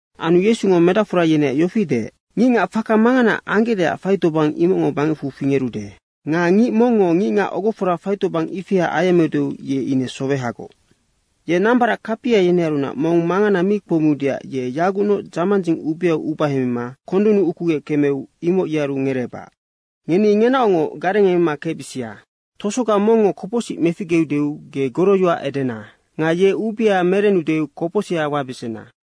Anu Yesungo medacfora yeneac yofi deec, “Ngicngac faka mangana anggecdeac faitobang, imocngo bangecfu fingerude. Nga ngic mongngo ngicngac ogofora faitobang ifia ayemmeude, ye ine sowehagoc. Ye nambarac kapia yenearunac mong mangana mi kpoumiudeac ye yagucnoc dzamandzing ubeau ubahemima kondunnu ukugec kemeu, imoc yearu ngereebac. Ngeni ngenaocngoc garengemema kecbisia. Tosoga mongngo kopocsic meficgeudeu ge goroyoac edena. Nga ye ubea merenudeu kopocsiha wabesena.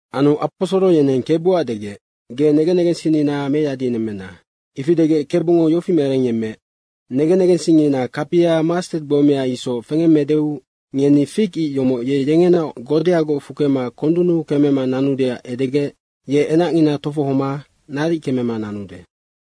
Anu aposoro yeneng Kebuac degec, “Ge negen negensinnina meyadinemmena.” Ifi degec Kebungo yofi merengyemmeec, “Negen negensingngina kapia mastet gbomea isoc fengemmeudeu ngeni fig ic yomoc ye yengenaoc godeagoc fukema kondunnu kemema nanudeac edegec ye enacngina tofohoma naric kemema nanude.”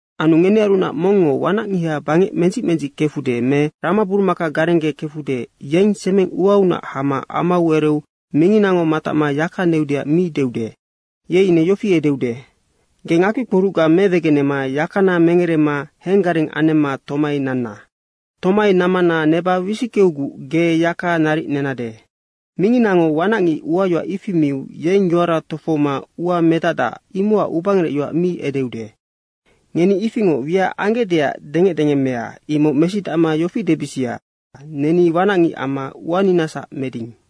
“Anu ngenearunac mongngo wanacngiha bangec mendzic mendzic kefude me ramaburumaka garenggekefude, yeng semeng uaunac hama amau ereu minginango matacma yaka neudeac mi deude. Ye ine yofi edeude, ‘Ge ngakpikporucga mewegenema yakana mengerema henggareng anemma tomai nanna. Tomai nammana neba wisickeuguc ge yaka naric nenade.’ Minginango wanacngic uayoac ifi miu yeng yoara tofohoma ua medacdac, imocac ubangerecyoac mi edeude. Ngeni ifingoc wiac anggecdeac dengecdengemmea, imoc mesidacma yofi debisia, ‘Neni wanacngic amma uaninasac meding.’”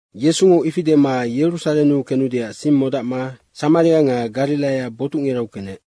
Yesungo ifi dema Yerusarennu kenudeac sing modacma Samaria nga Gariraia botucngirau kenec.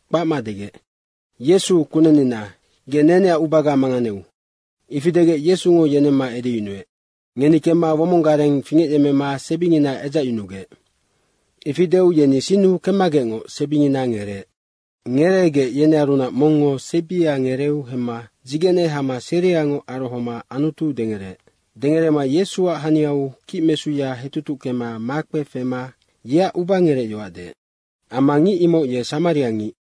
kpacma degec, “Yesu, kunennina, ge neneac ubaga manganeu.” Ifi degec Yesungo yenemma edeyunuec, “Ngeni kemma womong gareng fingecyemmema sebingina edzacyunugec.” Ifi deu yeni sinnu kemmagecngoc sebingina ngereec. Ngereegec yenearunac mongngo sebia ngereeu hemma dzigene hama seriangoc arohoma Anutu dengereec. Dengerema Yesuac haniau kicmesuya hetutuckema makpe fema yeac ubangerec yoac deec. Amma ngic imoc ye Samariangic.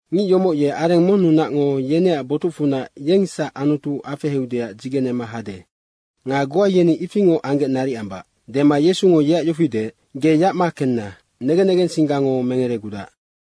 Ngic yomoc ye areng monnunacngo yeneac botucfunac yengsac Anutu afeheudeac dzigenema hade nga goa yeni ifingoc anggec naric ambac.” Dema Yesungo yeac yofi deec, “Ge yacma kenna, negen negensinggango mengeregudac.”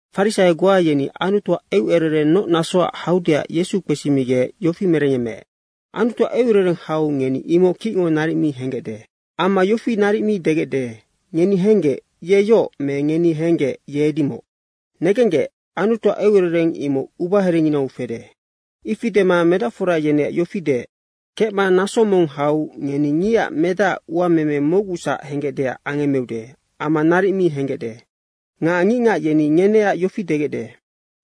Farisaio goa yeni Anutuac eucerereng noc nasoac haudeac Yesu kpesimigec yofi merengyemmeec, “Anutuac eucerereng hau ngeni imoc kicngo naric mi henggecde. Amma yofi naric mi degecde, ‘Ngeni henggec, ye yoc me ngeni henggec, ye edimoc.’ Negenggec, Anutuac eucerereng imoc ubaherenginau fede.” Ifi dema medacfora yeneac yofi deec, “Kecma naso mong hau ngeni Ngicac Medacac uameme mocgusac henggecdeac angemmeude amma naric mi henggecde. Nga ngicngac yeni ngeneac yofi degecde,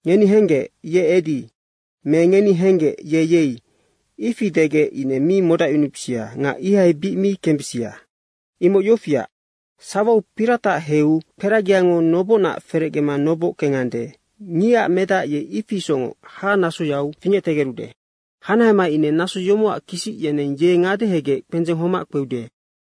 ‘Ngeni henggec, ye edi.’ me ‘Ngeni henggec, ye yei.’ Ifi degec ine mi modacyunubisia nga ihai bic mi kembisia. Imoc yofiac, sawau piratac heiu kperagiango nobocnac ferecgema noboc kengande, Ngicac Medac ye ifi isocngoc hahanasoyau fingectegerude. Hanahema ine naso yomocac kisic yeneng ye ngadehegec kpendzeng homac kpeude.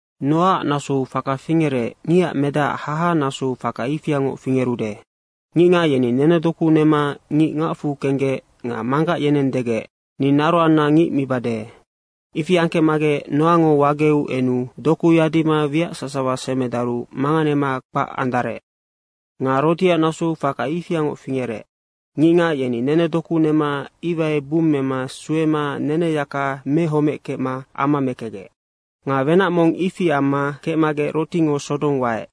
Noaac nasou faka fingerec, Ngicac Medacac haha nasou faka ifiangoc fingerude. Ngicngac yeni nenedoku nema ngic ngacfu kenggec nga manggac yeneng degec, ‘Ni naroanna ngic mibade.’ Ifi angkecmagec Noango wageu enu doku yadima wiac sasawa semedaru manganema kpac andarec. Nga Rotiac nasou faka ifiangoc fingerec. Ngicngac yeni nenedoku nema iwai bummema suema neneyaka mehomeckecma ama mekecgec. Nga wenac mong ifi amma kecmagec Rotingo Sodong waec,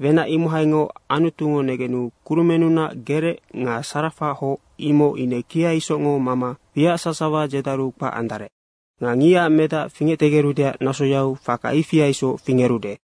wenac imohaingoc Anutungo negenu kurumennunac gerec nga sarafa hoc imoc ine kia isocngo mama wiac sasawa dzedaru kpac andarec. Nga Ngicac Medac fingectegerudeac nasoyau faka ifia isoc fingerude.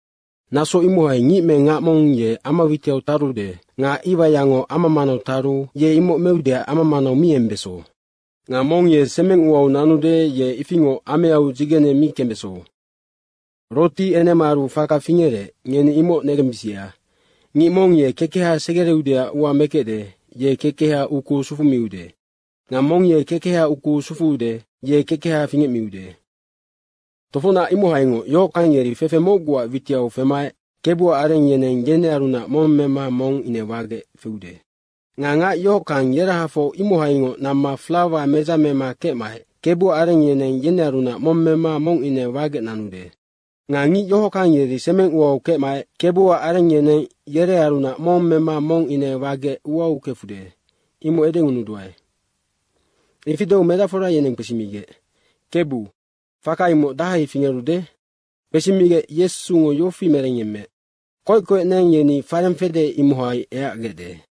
Naso imohai ngic me ngac mong ye ama witiau tarude nga iwaiyango ama manau taru ye imoc meudeac ama manau mi embeso. Nga mong ye semeng uau nanude, ye ifingoc ameau dzigene mi kembeso. Roti enemaaru faka fingerec, ngeni imoc negensibisia. Ngic mong ye kekeha segereudeac ua mekecde, ye kekeha ukuu sufumiude nga mong ye kekeha ukuu sufuude, ye kekeha fingecmiude. Tofocnac imohaingoc yohockang yeri fefe mocguac witiau femaec Kebuac areng yeneng yerearunac mong mema mong ine wagec feude. Nga ngac yohockang yerahafoc imohaingoc namma flawa medzamema kecmaec Kebuac areng yeneng yerearunac mong mema mong ine wagec nanude. Nga ngic yohockang yeri semeng uau kecmaec Kebuac areng yeneng yerearunac mong mema mong ine wagec uau kefude, imoc edengunuduae.” Ifi deu medacfora yeneng kpesimigec, “Kebu, faka imoc dahai fingerude?” Kpesimigec Yesungo yofi merengyemmeec, “Koec koec neng yeni fareng fede, imohai eacgecde.”